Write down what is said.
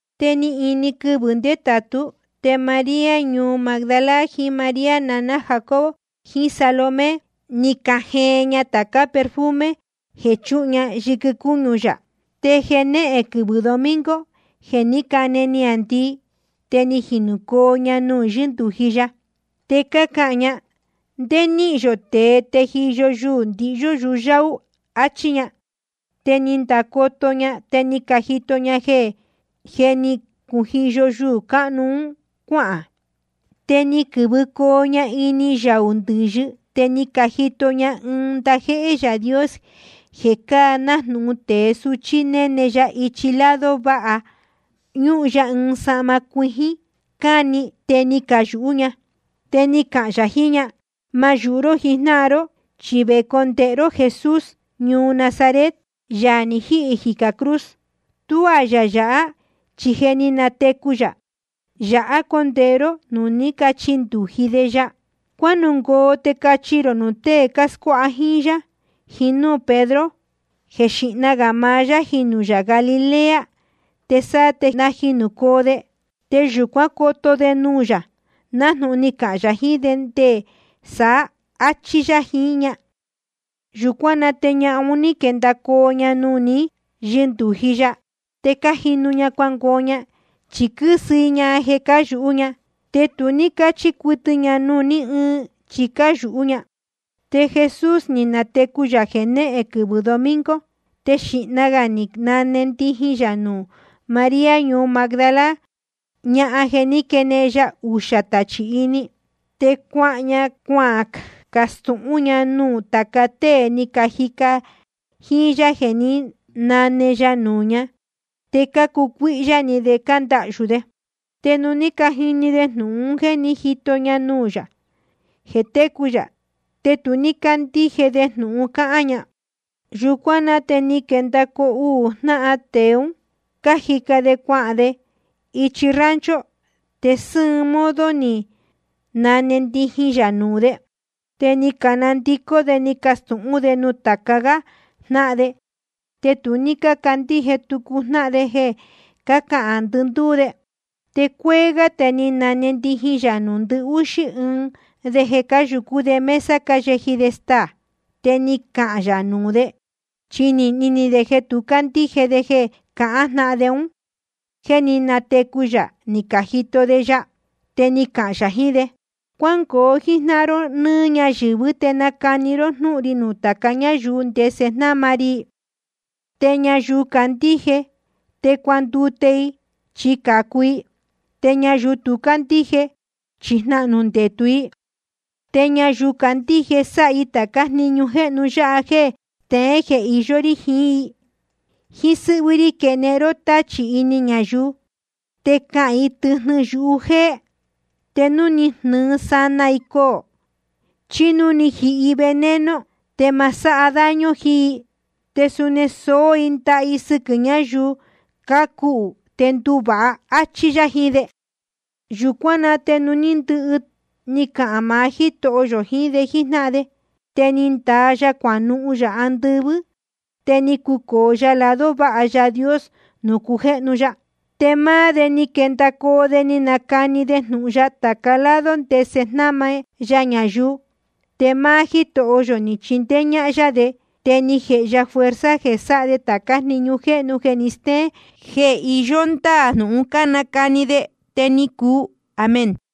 Te ni ini quɨvɨ̄ ndétātú, te María ñuu Magdala, jiín María naná Jacobo, jiín Salomé, ni cajeen ña tācá perfume jeē quíchuhun ña yɨquɨ cúñu yā. Te jenéhen quɨvɨ̄ domingo, jeē ní cane niāndii, te ni jinūcoo ña nuū ní yɨndūji ya. Te cácahān ña: ¿Ndé níhīn yō tēe tejiyo yuū ndihyú yuhu yáú? áchí ña. Te ni candacoto ña, te ni cajito ña jeē jé ni cujiyo yuū cáhnu un cuáhān. Te ni quɨ̄vɨcoo ña ini yaū ndɨ̄yɨ. Te ni cajito ña ɨɨn ndajéhé Yaā Dios jeē cáa nájnūhun tēe suchí, néne ya ichi lado váha, ñúhun ya ɨɨn sahma cuijín cáni. Te ni cayūhú ña. Te ni cahān yā jiín ña: Ma yūhu ró jijnáhan ró. Chi vecondēhe ró Jesús ñuu Nazaret, Yaā ni jíhī jicā cruz. Tuá yā yāhá, chi je ni natecu yā. Yāhá condēhé ró nuū ní cachindūji de ya. Cuánungoo te cachi rō nuū tée cáscuáha jíín yá, jíín núū Pedro, jeē xíhna gā maá yá jinū Galilea, te sáá te najinūcoo de. Te yūcuán coto de nuū yā, nájnūhun ni cahān yā jiín de nde saá, áchí yá jiín ña. Yūcuán na te ñahan un ní quendacoo ña nuū ní yɨndūji ya, te cájinu ña cuangoo ña. Chi quɨ́sɨ i ña jeē cáyūhú ña. Te tu ní cácachi cuɨtɨ ña nuū ní ɨɨn, chi cáyūhú ña. Te Jesús ni natecu yā jenéhen quɨvɨ̄ domingo. Te xīhna gā ni nane ndijin yā nuū María ñuu Magdala, ñahan jeē ní quenehen ya uxā tachī ini. Te cuahān ña cuacastūhún ña nuū tāca tée ni cajica jíín yá jeē ní nane ya nuū ña. Te cácucuíhyá ni de te cándahyū de. Te nuū ní cajini de jnūhun jeē ní jito ña nuū yā jeē técu yā, te tu ní cácandíje de jnūhun cáhán ña. Yūcuán na te ni quendacoo uū jnáhan tēe ún, cájica de cuahān de ichi rancho, te sɨ́ɨn modo ni nane ndijin yā nuū de. Te ni canandicó de, ni cacastūhún de nuū tāca gá jnáhan de. Te ni tu ní cácandíje tucu jnáhan de jeē cácahān ndɨndúú de. Te cúcuéé gá te ni nane ndijin yā nuū ndɨhúxí ɨɨn de jeē cáyūcú de mesa cáyeji de staā. Te ni cahān yā nuū de, chi nīhni ni de jeē tu cácandíje de jeē cácahān jnáhan de un, jéē ní natecu yā ni cajito de ya. Te ni cahān yā jiín de: Cuángoo jíjnáhan ró nɨ́ɨ́ ñayɨ̄vɨ́, te nacani ró jnúhun ri nuū tāca ñáyuu ndese jnáma ri i. Te ñayuu candíje te cuandute i, chi cācu i. Te ñayuu tú candíje, chi jnahnū ndetū i. Te ñayuu candíje, sáha i tācá jniñu jéhnu yáha jeē steén jeē iyó rí jiín i: Jíín sɨ́hvɨ́ rí quenehen i tachī ini ñayuu. Te cahān i tɨjnɨ yuhu jéé. Te núu ni jnɨɨ sanaa i coō, chí núu ni jihi i veneno, te ma sáha daño jiín i. Te suni soó i ndaha i sɨquɨ̄ ñáyuu cácuhū, te nduvāha. Achí yá jiín de. Yūcuán na te nuū ní ndɨhɨ ni cahān maá Jítoho yō jiín de jíjnáhan de, te ni ndaa ya cuanuhun yā andɨvɨ́, te ni cucōo ya lado váha Yaā Dios nuū cujéhnu ya. Te máá de ni quendacoo de, ni canacani de jnūhun ya tāca lado ndese jnáma ya ñayuu. Te máá Jítoho yō ni chindéé ñáhán yá de. Te ni jēhe ya fuerza jeē sáha de tācá jniñu jéhnu jeē steén jeē iyó ndáā jnūhun cánacani de. Te ni cuu. Amén.